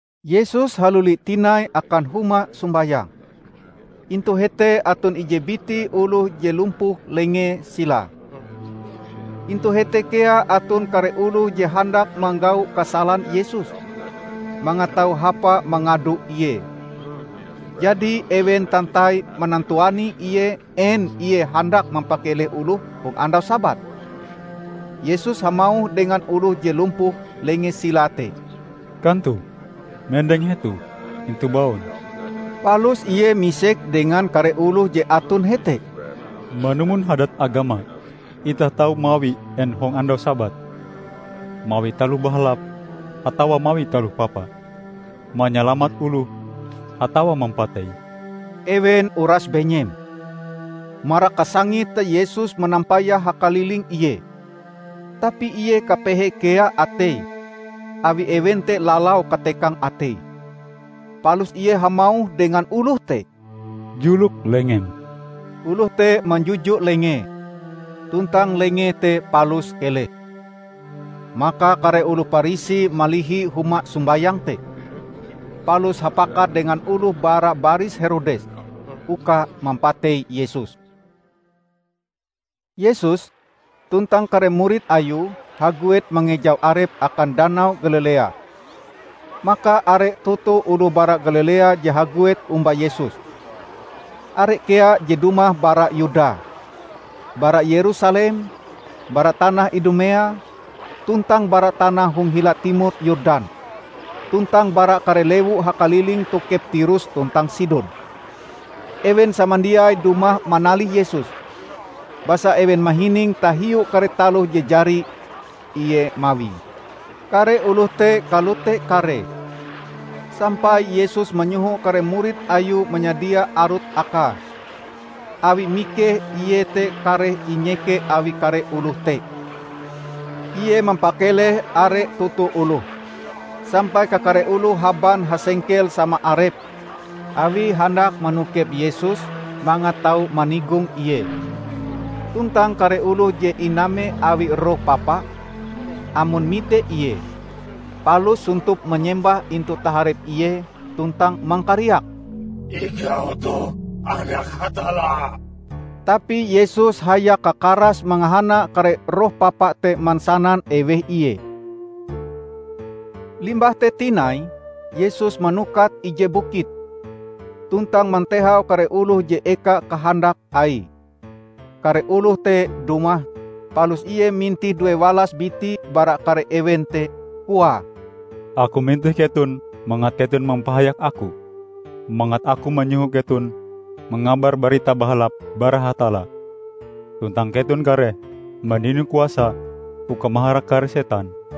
Yesus haluli tinai akan huma sombayang. Intu hete aton ije biti oloh je lumpuh lengee silae. Intu hete kea aton kare oloh je handak manggau kasalan Yesus, mangat tau hapa mangado Ie. Jadi ewen tantai manantuani Ie en Ie handak mampakeleh oloh hong andau Sabat. Yesus hamauh dengan oloh je lumpuh lengee silae te, "Kantoh mendeng hetoh, intu baun." Palus Ie misek dengan kare oloh je aton hete, "Manumon hadat agama, itah tau mawi en hong andau Sabat? Mawi taloh bahalap atawa mawi taloh papa? Manyalamat oloh atawa mampatei?" Ewen uras benyem. Marak kasangite Yesus manampayah hakaliling Ie tapi Ie kapehe kea ateie awi ewen te lalau katekang ateie. Palus Ie hamauh dengan oloh te, "Julok lengem." Oloh te manjuju lengee, tuntang lengee te palus keleh. Maka kare oloh Parisi malihi huma sombayang te, palus hapakat dengan oloh bara baris Herodes, uka mampatei Yesus. Yesus tuntang kare murid Ayue haguet mangejau Arepe akan Danau Galilea. Maka are toto oloh bara Galilea je haguet omba Yesus. Are kea je dumah bara Yuda, bara Yerusalem, bara tanah Idumea, tuntang bara tanah hong hila timor Yordan, tuntang bara kare lewu hakaliling tokep Tirus tuntang Sidon. Ewen samandiai dumah manalih Yesus, basa ewen mahining tahiu kare taloh je jari Ie mawie. Kare oloh te kalote karee, sampai Yesus manyoho kare murid Ayue manyadia arut akae, awi mikeh Ie te kareh inyeke awi kare oloh te. Ie mampakeleh are toto oloh, sampai kakare oloh haban hasengkel sama arepe awie handak manokep Yesus mangat tau manigong Ie. Tuntang kare oloh je iname awi roh papa, amon mite Ie, palus sontop manyembah intu taharep Ie tuntang mangkariak, "Ikau toh Anak Hatalla!" Tapi Yesus hayak kakarase mangahana kare roh papa te mansanan eweh Ie. Limbah te tinai Yesus manukat ije bukit, tuntang mantehau kare oloh je eka kahandak Aie. Kare oloh te dumah, palus Ie mintih duewalas biti bara kare ewen te. Koae, "Aku mintih keton mangat keton mampahayak Aku, mangat Aku manyoho keton mangabar Barita Bahalap bara Hatalla, tuntang keton kareh mandino kuasa uka maharak kare setan."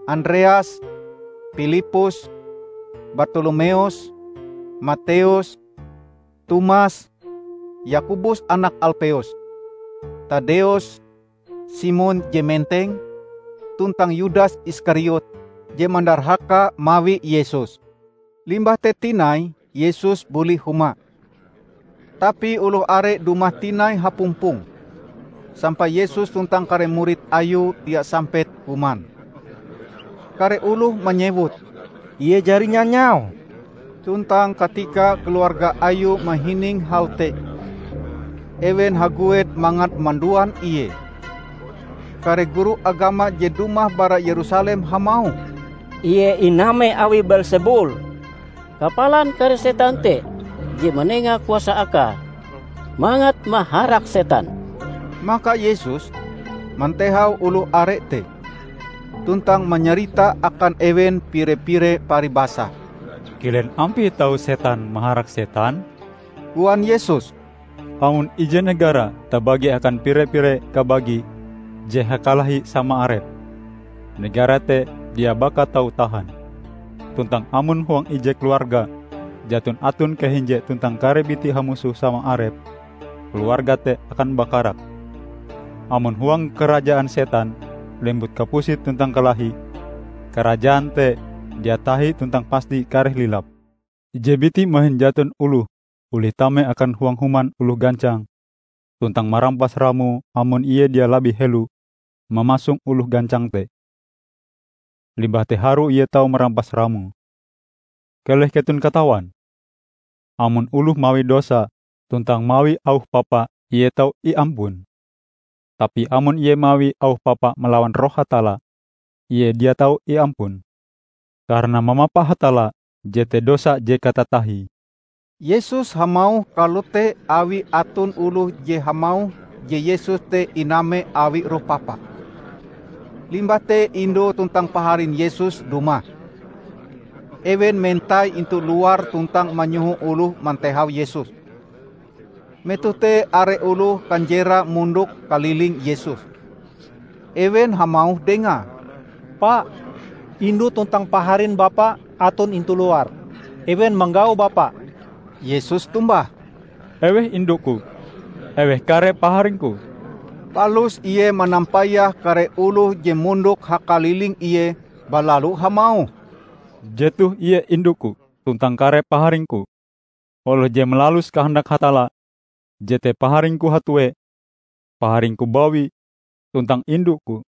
Andreas, Pilippus, Bartolomeus, Mateus, Tomas, Yakobus anak Alpeus, Taddeus, Simon je Menteng, tuntang Yudas Iskariot je mandarhaka mawi Yesus. Limbah te tinai Yesus buli huma. Tapi oloh are dumah tinai hapumpong, sampai Yesus tuntang kare murid Ayue dia sampet kuman. Kare oloh manyewut, "Ie jari nyanyau!" Tuntang katika keluarga Ayue mahining hal te, ewen haguet mangat manduan Ie. Kare guru agama je dumah bara Yerusalem hamauh, "Ie iname awi Beelsebul! Kapalan kare setan te je manenga kuasa Akae mangat maharak setan." Maka Yesus mantehau oloh are te, tuntang manyarita akan ewen pire-pire paribasa. "Kilen ampie tau setan maharak setan?" koan Yesus. "Amon ije negara tabagi akan pire-pire kabagi je hakalahi sama arepe, negara te dia baka tau tahan. Tuntang amon huang ije keluarga jaton aton kahinje tuntang kare bitie hamusoh sama arepe, keluarga te akan bakarak. Amon huang karajaan Setan lembut kapusit tuntang kalahi, karajaan te dia tahi tuntang pasti kareh lilap. Ije biti mahin jaton oloh olih tame akan huang human oloh gancang tuntang marampas ramoe amon ie dia labih helo mamasong oloh gancang te. Limbah te harue ie tau marampas ramoe. Keleh keton katawan! Amon oloh mawi dosa tuntang mawi auh papa ie tau iampun. Tapi amon ie mawi auh papa malawan Roh Hatalla, ie dia tau iampun! Karana mamapa Hatalla jete dosa je katatahie." ( Yesus hamauh kalote awi aton oloh je hamauh je Yesus te iname awi roh papa.) Limbah te indu tuntang paharin Yesus dumah. Ewen mentai intu luar tuntang manyoho oloh mantehau Yesus. Metoh te are oloh kanjerae mondok kaliling Yesus. Ewen hamauh Dengae, "Pa, indu tuntang paharin Bapa aton intu luar. Ewen manggau Bapa." Yesus tombah, "Eweh indu-Ku? Eweh kare paharing-Ku?" Palus Ie manampayah kare oloh je mondok hakaliling Ie balalu hamauh, "Jetoh ie indu-Ku tuntang kare paharing-Ku! Oloh je malalus kahandak Hatalla, jete paharing-Ku hatue, paharing-Ku bawi, tuntang indu-Ku."